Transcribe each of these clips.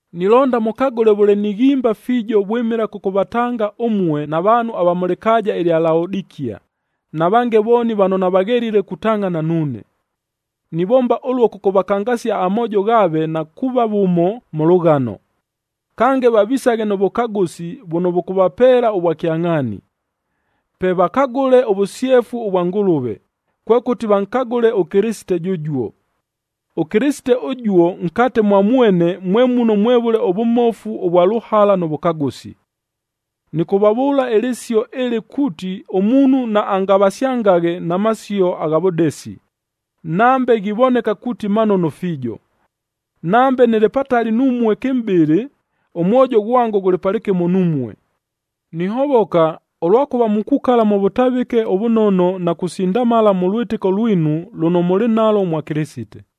Nilonda mʉkagʉle vʉle nighimba fiijo vwɨmɨla kʉkʉvatanga ʉmue na vaanhu ava mʉ lɨkaaja ɨlya Laodikia, na vange vooni vano navaghelile kutangʼhana nuune. Nivomba ʉluo kʉkʉvakangasia amoojo ghaave na kuuva vʉmo mʉ lʉghano. Kange, vavisaghe nʉ vʉkagʉsi vʉno vʉkʉvapeela ʉvwakyangʼhaani. Pe vakagʉle ʉvʉsyefu vwa Ngʉlʉve, kwekʉti vankagʉle ʉKɨlɨsite jʉjuo. ɄKɨlɨsite ʉjuo nkate mwa mwene mwe muno mwevʉle ʉvʉmofu vwa lʉhala nʉ vʉkagʉsi. Nɨkʉvavʉʉla ɨlɨsio ɨlɨ kuuti ʉmuunhu naangavasyangaghe na masio agha vʉdesi, nambe ghivoneka kuuti manono fiijo. Nambe nɨlɨ patali numue kɨmʼbɨlɨ, ʉmwojo ghwango ghʉlɨ palɨkɨmo numue. Nihovoka, ʉlwakʉva mukukala mʉ vʉtavɨke ʉvʉnono na kusindamala mʉ lwɨtɨko lwinu lʉno mʉlɨ nalwo mwa Kɨlɨsite.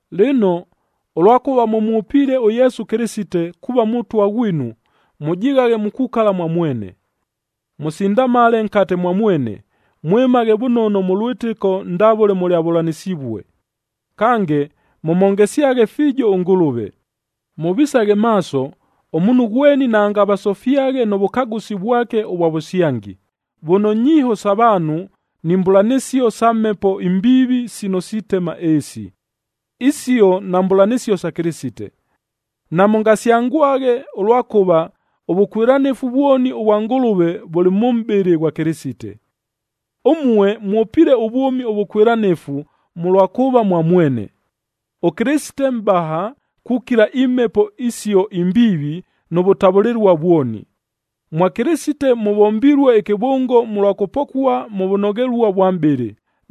Lɨno, ʉlwakʉva mʉmwʉpiile ʉYesu Kɨlɨsite, kuuva Mʉtwa ghwinu, mʉjighaghe mukukala mwa mwene. Mʉsindamale nkate mwa mwene, mwɨmaghe vʉnono mʉ lwɨtɨko ndavʉle mʉlyavʉlanɨsivue. Kange, mʉmhongesyaghe fiijo ʉNgʉlʉve. Mʉvisaghe maaso, ʉmuunhu ghweni naangavasofyaghe nʉ vʉkagʉsi vwake ʉvwa vʉsyangi, vʉno nyiiho sa vaanhu ni mbʉlanɨsio sa mhepo imbiivi sino sitema ɨɨsi. Isio nambʉlanɨsio sa Kɨlɨsite. Namʉngasyangwaghe, ʉlwakʉva ʉvʉkwɨlanɨfu vwoni ʉvwa Ngʉlʉve vʉlɨ mʉ mʼbɨlɨ ghwa Kɨlɨsite. Ʉmue mwʉpiile ʉvwʉmi ʉvʉkwɨlanɨfu mʉlwa kuuva mwa mwene. ɄKɨlɨsite mʼbaha kukila imhepo isio imbiivi nʉ vʉtavʉlɨlua vwoni. Mwa Kɨlɨsite mʉvombilue ɨkɨvʉngo mʉlwa kʉpokua mʉ vʉnoghelua vwa mʼbɨlɨ,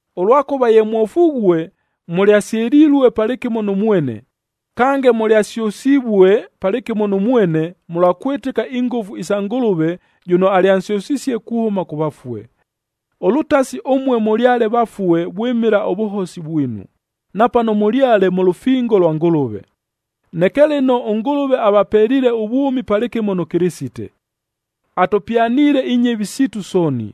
Ʉlwakʉva ye mwofughue, mʉlyasyɨlilue palɨkɨmo nʉ mwene, kange mʉlyasyʉsivue palɨkɨmo nʉ mwene, mʉlwa kwɨtɨka ingʉfu sa Ngʉlʉve jʉno alyansyʉsisie kuhʉma kʉ vafue. Ʉlʉtasi ʉmue mʉlyale vafue vwɨmɨla ʉvʉhosi vwinu, na pano namʉlyale mʉ lʉfingo lwa Ngʉlʉve. Neke lɨno, ʉNgʉlʉve avapeliile ʉvwʉmi palɨkɨmo nʉ Kɨlɨsite. Atʉpyaniile inyɨvi siitu sooni,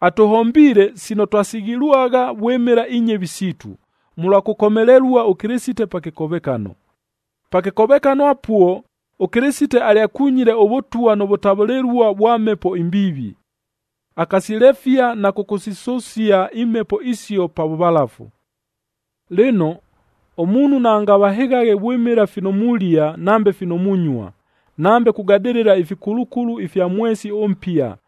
atʉhombiile sino twasighilwagha vwɨmɨla inyɨvi siitu, mʉlwa kʉkomelelua ʉKɨlɨsite pa kɨkovekano. Pa kɨkovekano apuo ʉKɨlɨsite alyakunyile ʉvʉtwa nʉ vʉtavʉlɨlua vwa mhepo imbiivi. Akasilefia na kʉkʉsisʉsia imhepo isio pa vʉvalafu. Lɨno, ʉmuunhu naangavahɨghaghe vwɨmɨla fino mulia, nambe fino munyua, nambe kugadɨlɨla ifikulukulu ifya mwesi ʉmpia,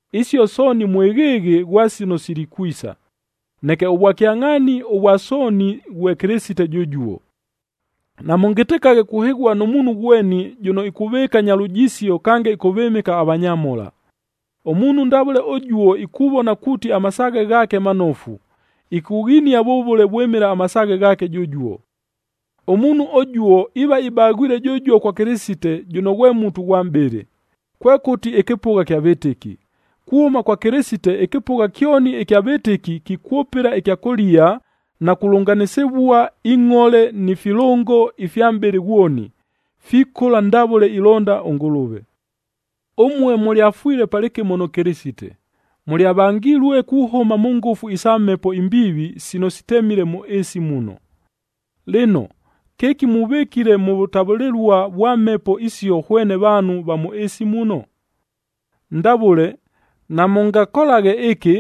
Isio sooni mwɨghɨɨghɨ ghwa sino silikwisa. Neke ʉvwakyangʼhaani ʉvwa sooni ghwe Kɨlɨsite jʉjuo. Namʉngɨtɨkaghe kuhɨghua nʉ muunhu ghweni jʉno ikuvɨɨka nya lujisio kange ɨkʉvɨmɨka avanyamhola. Ʉmuunhu ndavʉle ʉjuo ikuvona kuuti amasaaghe ghaake manofu, ikughinia vʉvʉle vwɨmɨla amasaaghe ghaake jʉjuo. Ʉmuunhu ʉjuo iiva ibaghwile jʉjuo kwa Kɨlɨsite jʉno ghwe mutu ghwa mʼbɨlɨ, kwekʉti ɨkɨpʉgha ɨkya vɨtɨki. Kuhʉma kwa Kɨlɨsite ɨkɨpʉgha kyoni ɨkya vɨtɨki kikwʉpɨla ɨkyakʉlia na kulʉnganɨsɨvua ingʼhole ni filʉngo ifya mʼbɨlɨ ghwoni, fikʉla ndavʉle ilonda ʉNgʉlʉve. Ʉmue mʉlyafwile palɨkɨmo nʉ Kɨlɨsite, mʉlyavangilue kuhʉma mʉ ngʉfu isa mhepo imbiivi sino sitemile mʉ ɨɨsi muno. Lɨno, kɨki muvɨkile mʉ vʉtavʉlɨlua vwa mhepo isio hwene vaanhu va mʉ ɨɨsi muno? Ndavʉle, “Namʉngakolaghe ɨkɨ,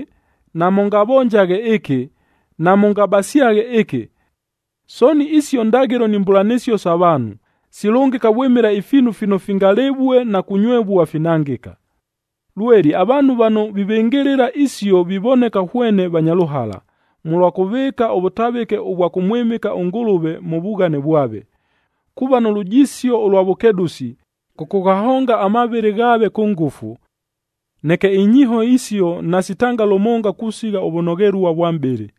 namʉngavonjaghe ɨkɨ, namʉngabasyaghe ɨkɨ!” Sooni isio ndaghɨlo ni mbʉlanɨsio sa vaanhu, silʉngɨka vwɨmɨla ifiinu fino fingalɨvue na kunywevua, finangɨka. Lweli avaanhu vano vivɨngɨlɨla isio vivoneka hwene vanya lʉhala, mʉlwa kʉvɨɨka ʉvʉtavɨke ʉvwa kʉmwɨmɨka ʉNgʉlʉve mʉ vughane vwave, kuuva nʉ lujisio ʉlwa vʉkedʉsi, kʉkʉghahonga amavɨlɨ ghaave kʉ ngʉfu. Neke inyiiho isio nasitanga lʉmonga kusigha ʉvʉnoghelua vwa mʼbɨlɨ.